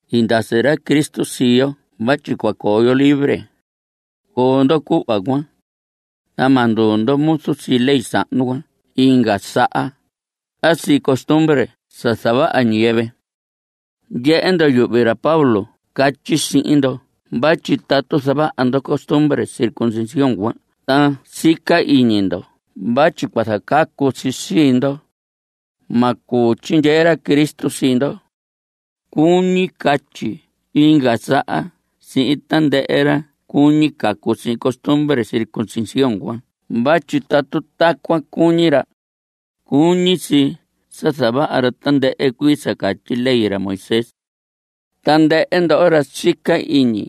I ndasi ra Cristo sii yo vatyi cua coo yo libre. Coo ndo cuhva cuan, ta ma nduu ndo muzu sii ley sahnu cuan inga saha a sii costumbre sa zavaha ñiyɨvɨ. Ndyehe ndo, yuhvi ra Pablo catyi sihin ndo vatyi tatu zavaha ndo costumbre circuncisión cuan ta sica iñi ndo vatyi cua zacacu si sii ndo, ma cuu tyindyee ra Cristo sii ndo. Cuñi catyi inga saha sihin tandɨhɨ ra cuñi cacu sihin costumbre circuncisión cuan vatyi tatu tacuan cuñi ra, cuñi si sa zavaha ra tandɨhɨ cuii sa catyi ley ra Moisés. Tandɨhɨ ndoho ra sica iñi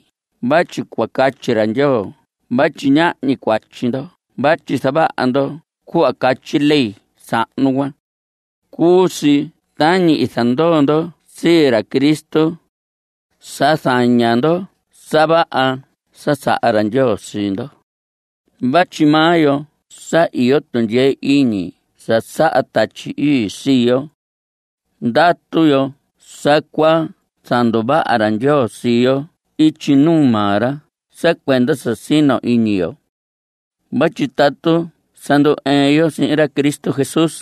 vatyi cua catyi ra Ndyoo vatyi ñahñi cuatyi ndo vatyi zavaha ndo cuhva catyi ley sahnu cuan, cuu si tañi i zandoo ndo sii ra Cristo. Sa zaña ndo sa vaha sa saha ra Ndyoo sii ndo. Vatyi maa yo sa iyo tundyee iñi sa saha Tatyi Ii sii yo, ndatu yo sa cua zanduvaha ra Ndyoo sii yo ityi nuu maa ra sa cuenda sa sino iñi yo. Vatyi tatu sa ndu‑ɨɨn yo sihin ra Cristo Jesús,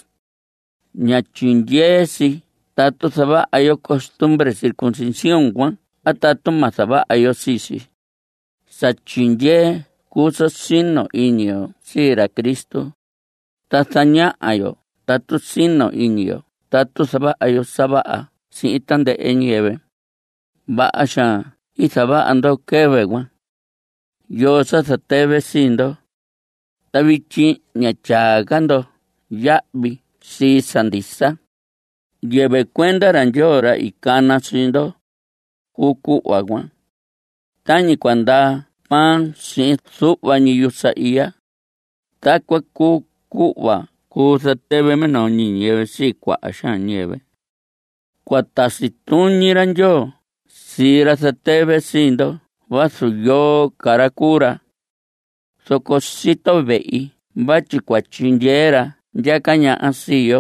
ña tyindyee si tatu zavaha yo costumbre circuncisión cuan a tatu ma zavaha yo sii si. Sa tyindyee cuu sa sino iñi yo sii ra Cristo, ta zañaha yo tatu sino iñi yo tatu zavaha yo sa vaha sihin tandɨhɨ ñiyɨvɨ. Vaha xaan i zavaha ndo quɨvɨ cuan. ¿Yoo sa zatɨvɨ sii ndo? ta vityi ña tyaa ca ndo yahvi sii sa ndisa. Yɨvɨ cuenda ra Ndyoo, ra i cana sii ndo, cuu cuhva cuan. Tañi cua ndaa pan sihin zuhva ñi yusa iya, tacuan cuu cuhva cuu zatɨvɨ minoo ñi ñiyɨvɨ sii cuaha xaan ñiyɨvɨ. Cua tasi tuñi ra Ndyoo sii ra zatɨvɨ sii ndo vazu yoo ca ra cuu ra. Zoco sito vehi vatyi cua tyindyee ra ndyaca ñaha sii yo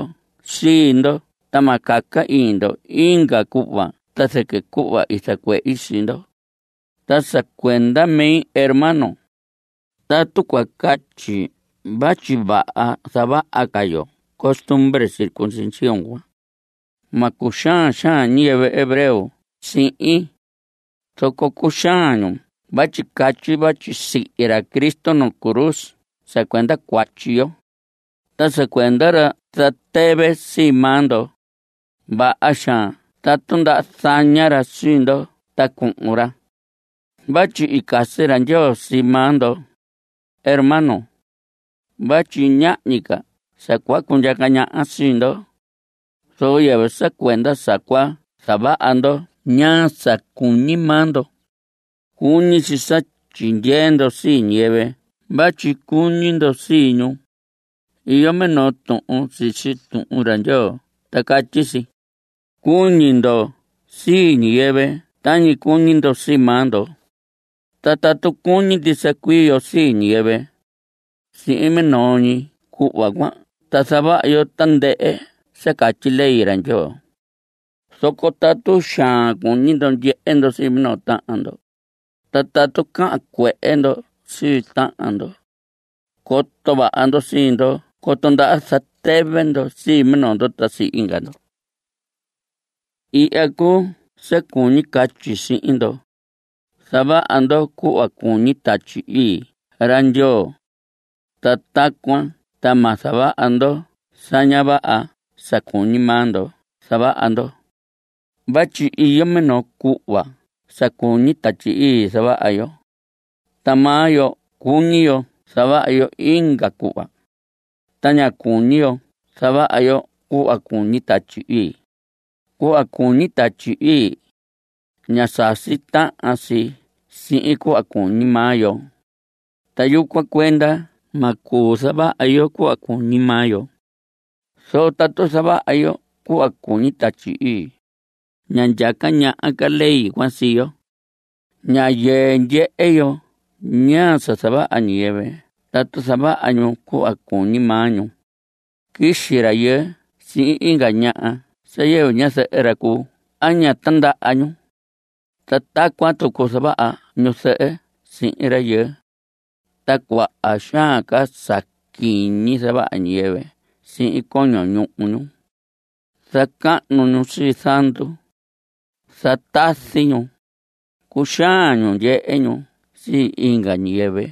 sii ndo ta ma caca iñi ndo inga cuhva ta zɨquɨ cuhva i zacuehi sii ndo. Ta sa cuenda mi, hermanos, tatu cua catyi vatyi vaha zavaha ca yo costumbre circuncisión cuan, ma cuxaan xaan ñiyɨvɨ hebreo sihin. Zoco cuxaan ñu vatyi catyi vatyi sihi ra Cristo nuu cruz sa cuenda cuatyi yo. Ta sa cuenda ra zatɨvɨ sii maa ndo ¡vaha xaan tatu ndaha zaña ra sii ndo ta cuhun ra! Vatyi i casi ra Ndyoo sii maa ndo, hermanos, vatyi ñahñi ca sa cua cundyaca ñaha sii ndo, zoco yɨvɨ sa cuenda sa cua zavaha ndo ñaa sa cuñi maa ndo. Cuñi si sa tyindyee ndo sii ñiyɨvɨ vatyi cuñi ndo sii ñu. Iyo minoo tuhun sisi Tuhun ra Ndyoo ta catyi si: “Cuñi ndo sii ñiyɨvɨ tañi cuñi ndo sii maa ndo.” Ta tatu cuñi ndisa cuii yo sii ñiyɨvɨ, sihin minoo ñi cuhva cuan ta zavaha yo tandɨhɨ sa catyi ley ra Ndyoo. Zoco tatu xaan cuñi ndo ndyehe ndo sii minoo tahan ndo, ta tatu cahan cuehe ndo sii tahan ndo, coto vaha ndo sii ndo coto ndaha zatɨvɨ ndo sii minoo ndo ta sii inga ndo. Ihya cuu sa cuñi catyi sihin ndo: Zavaha ndo cuhva cuñi Tatyi Ii ra Ndyoo, ta tacuan ta ma zavaha ndo sa ña vaha sa cuñi maa ndo zavaha ndo. Vatyi iyo minoo cuhva sa cuñi Tatyi Ii zavaha yo, ta maa yo cuñi yo zavaha yo inga cuhva. Ta ña cuñi yo zavaha yo cuhva cuñi Tatyi Ii. Cuhva cuñi Tatyi Ii, ña sasi tahan si sihin cuhva cuñi maa yo. Ta yucuan cuenda ma cuu zavaha yo cuhva cuñi maa yo. Zoco tatu zavaha yo cuhva cuñi Tatyi Ii, ña ndyaca ñaha ca ley cuan sii yo. Ña yɨɨ ndyehe yo ñaa sa zavaha ñiyɨvɨ tatu zavaha ñu cuhva cuñi maa ñu. Quixi rayɨɨ sihin inga ñaha sa yɨvɨ ñazɨhɨ ra cuu a ña tindaha ñu. Ta tacuan tucu zavaha ñuzɨhɨ sihin rayɨɨ, ta cuaha xaan sa quiñi zavaha ñiyɨvɨ sihin coño ñuhu ñu. Zacahnu ñu sii zandu. Zatazi ñu. Cuxaan ñu ndyehe ñu sii inga ñiyɨvɨ.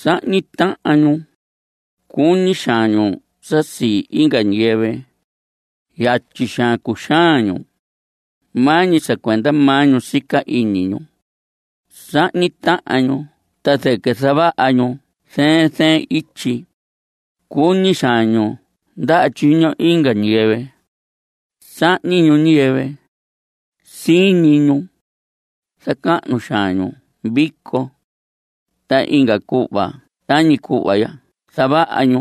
Sahñi tahan ñu. Cuñi xaan ñu sa sii inga ñiyɨvɨ. Yatyi xaan cuxaan ñu. Maa ñi sa cuenda maa ñu sica iñi ñu. Sahñi tahan ñu ta zɨquɨ zavaha ñu zɨɨn zɨɨn ityi. Cuñi xaan ñu ndaha tyiño inga ñiyɨvɨ. Sahñi ñu ñiyɨvɨ. Siñi ñu. Zacahnu xaan ñu vico. Ta inga cuhva tañi cuhva ya zavaha ñu.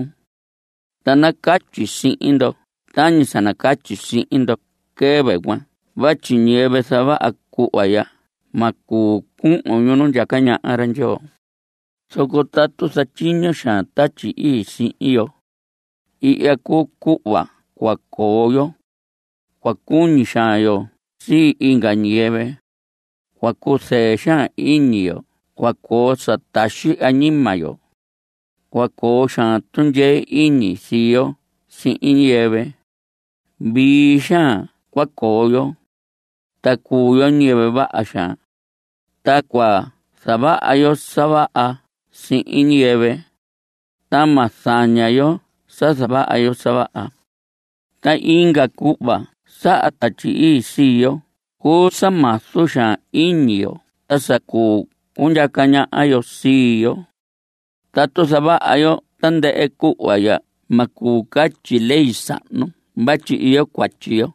Ta nacatyi sihin ndo tañi sa catyi sihin ndo quɨvɨ cuan vatyi ñiyɨvɨ zavaha cuhva ya ma cuu cuhun ñu nu ndyaca ñaha ra Ndyoo. Zoco tatu zatyiño xaan Tatyi Ii sihin yo, ihya cuu cuhva cua coo yo. Cua cuñi xaan yo sii inga ñiyɨvɨ; cua cuzɨɨ xaan iñi yo; cua coo sa taxi añima yo. Cua coo xaan tundyee iñi sii yo sihin ñiyɨvɨ. Vii xaan cua coo yo, ta cuu yo ñiyɨvɨ vaha xaan. Ta cua zavaha yo sa vaha sihin ñiyɨvɨ, ta ma zaña yo sa zavaha yo sa vaha. Ta inga cuhva saha Tatyi Ii sii yo cuu sa mazu xaan iñi yo ta sa cuu cundyaca ñaha yo sii yo. Tatu zavaha yo tandɨhɨ cuhva ya ma cuu catyi ley sahnu vatyi iyo cuatyi yo.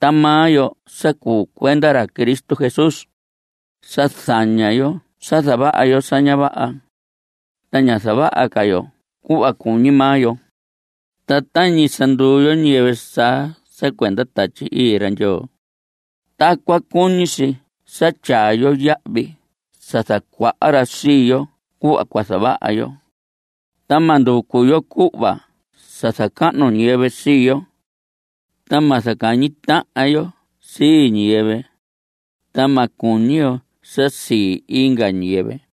Ta maa yo sa cuu cuenda ra Cristo Jesús, sa zaña yo sa zavaha yo sa ña vaha, ta ña zavaha ca yo cuhva cuñi maa yo. Ta tañi sa nduu yo ñiyɨvɨ saa sa cuenda Tatyi Ii ra Ndyoo, tacuan cuñi si sa tyaa yo yahvi sa zacuaha ra sii yo cuhva cua zavaha yo. Ta ma nducu yo cuhva sa zacahnu ñiyɨvɨ sii yo. Ta ma zacahñi tahan yo sii ñiyɨvɨ, ta ma cuñi yo sa sii inga ñiyɨvɨ.